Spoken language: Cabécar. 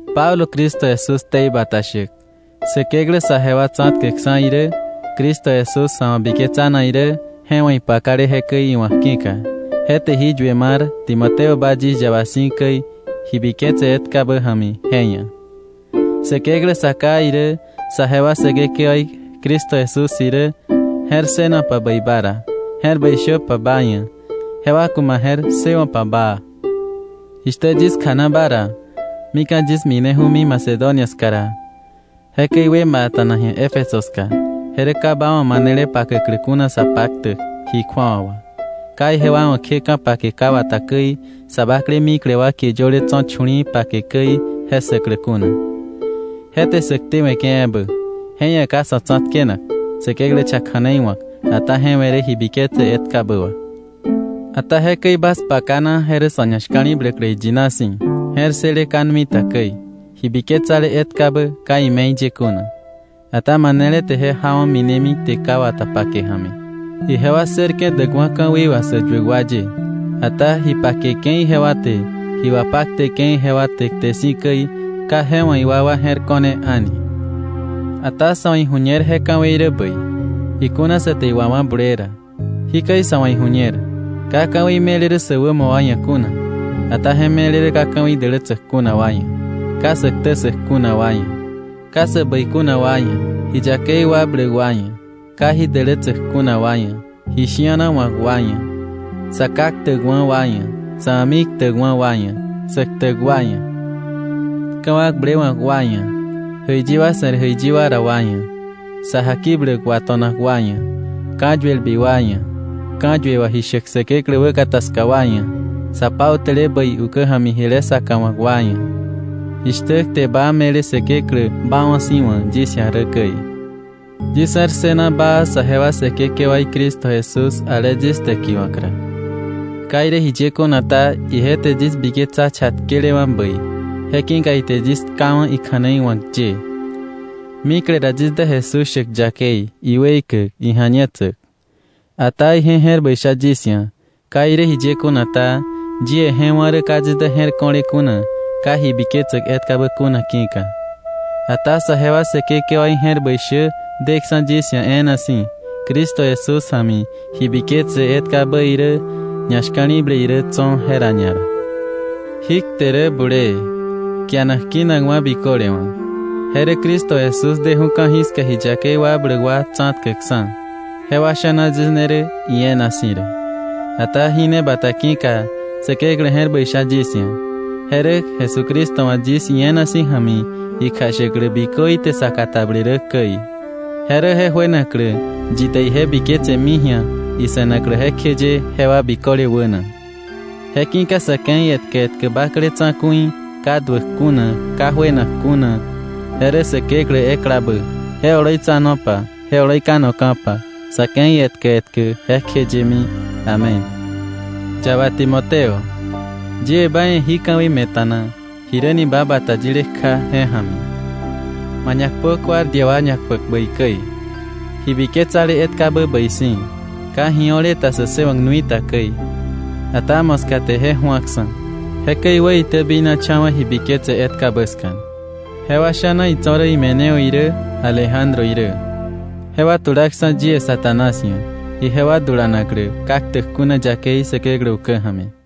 Pablo Cristo Jesús ktei bata shäk, Säkeklä saje wa tsa̱tkäkksa̱ irä Cristo Jesús sa̱ wa̱ biketsanak irä je wa̱ ipakale jekäi iwa̱k ki̱ka, je te jí yue mar Timoteo ba yis yaba si̱ käi ji biketse etkabä ja̱mi je ia̱. Säkeklä Sa Ká irä, sajewa Säkekewaí Cristo Jesús irä je̱r ssënopa bäi ba ra, je̱r bäi shöpa ba ia̱, jewa ku̱ ma je̱r ssëwo̱pa baa. Jishtä yis kjana ba ra mika̱ yis mineju̱mi Macedonia ska ra, jekäi wë ma a̱ta̱na ji̱a Éfeso ska, je rä ka ba wa̱ manele pakäklä kuna sä paktäk ji kju̱awa wà, ka ijewa wa̱ kje ka̱pake ka wata käi, sa bakle mikle wa kie yöle tso̱ chu̱li̱i̱ pake käi, je ssäklä kuna. Je te sä ktewe̱ke̱ ebä, je ia̱ ka sa̱ tsa̱tkenak Säkeklä cha kja̱nei wa̱k, ata je we̱ rä ji biketse etkabä wà. Ata jekäi bas pakana, je rä sa̱ ñashka̱li̱bläklä iyina si̱, je̱r ssële ka nui ta käi, ji biketsale etkabä ka ime̱i ye kuna. Ata manele te je jawa̱ minemi kte ka wata pake ja̱mi. Ijewa ssërke̱ däkwa̱ ka̱wei wà sä yuäk wa ye. Ata ji pakeke̱ ijewa te, ji wapakteke̱ ijewa te kte si̱ käi, ka je wa̱ iwakwa je̱r ko̱ne a̱ni. Ata sa̱ wa̱ iju̱ñer je ka̱wei rä bäi, ikuna sa te iwawá̱ bulee ra. Jikäi sa̱ wa̱ iju̱ñer, ka ka̱wei me̱le rä sä wämo wa ia̱ kuna, ata je me̱le rä ka ka̱wei dälätsäk kuna wa ia̱, ka sä ktä ssäk kuna wa ia̱, ka sä bäi kuna wa ia̱, ji yakei wakbläk wa ia̱, ka ji dälätsäk kuna wa ia̱, ji shi̱ana wa̱k wa ia̱, sa ká ktäkwa̱ wa ia̱, sa̱ a̱mi ktäkwa̱ wa ia̱, sä ktäk wa ia̱, ka̱wakblewa̱k wa ia̱, jäiyi wa se̱r jäiyi wa ra wa ia̱, sa jakibläk wato̱nak wa ia̱, ka̱yuelbi wa ia̱, ka̱yue wà ji shäk Säkeklä wäkata ska wa ia̱, sa pautäle bäi ukä ja̱mi jile saka wa̱k wa ia̱, jishtä kte baa me̱le Säkeklä baawa̱ si̱ wa̱ yis ia̱ rä käi. Yis je̱r ssëna baa sajewa Säkekewaí Cristo Jesús ale yis täkiwa̱k ra. Ka irä jiye kuna ta, ije te yis biketsa chatkelewa̱ bäi, je ki̱ka ite yis tkawa̱ ikja̱nei wa̱k ye. Mikle ra yis dä Jesús shäk yakei, iweikäk, ija̱ñetsäk. Ata ije je̱r bäi sha yis ia̱, ka irä jiye kuna ta, yie je wá̱ rä ka yis dä je̱r ko̱le kuna ka ji biketsäk etkabä kuna ki̱ka. Ata saje wa Säkekewaí je̱r bäi shä deksa̱ yis ia̱ e̱e̱na si̱, Cristo Jesús ja̱mi ji biketse etkabä irä, ñashka̱li̱ble irä tso̱, jera ñara. Jí kte rä bulee, kianak kinakwa̱ biköle wa̱. Je rä Cristo Jesús deju̱ ka̱jiska ji yakei wakbläk wa tsa̱tkäkksa̱. Jewa sha̱na yis ne rä ie̱e̱na si̱ rä. Ata ji ne bata ki̱ka Säkeklä je̱r bäi sha yis ia̱. Je rä Jesucristo wa̱ yis ie̱e̱na si̱ ja̱mi ikjashäklä bikö ite sa katableke̱ rä käi. Je rä je juenaklä yi te ije biketsemi ji̱a ise̱naklä jekjeye jewa biköle wäna. Je ki̱ka sa̱ ke̱i etkä etkä bakle Tsa̱ku̱i, ka duäk kuna, ka juenak kuna, je rä Säkeklä eklabä, je oloitsanopa je oloi kanoka̱pa sa̱ ke̱i etkä etkä jekjeyemi. ¡Amén! Yaba Timoteo, yie ba ia̱ jí ka̱wei me̱ta̱na jiräni ba bata yile kja je ja̱mi, ma ñakpö guardia wa ñakpäk bäi käi, ji biketsale etkabä bäi si̱, ka ji o̱le ta sä ssëwa̱k nui ta käi. Ata moska te je ju̱aksa̱. Jekäi iwäitäbinacha̱wa̱ ji biketse etkabä ska. Jewa sha̱na itso̱ rä Himeneo irä, Alejandro irä. Jewa tulaksa̱ yie Satanás ia̱, ijewa dulanaklä ka ktäk kuna yakei Säkeklä ukä ja̱mi.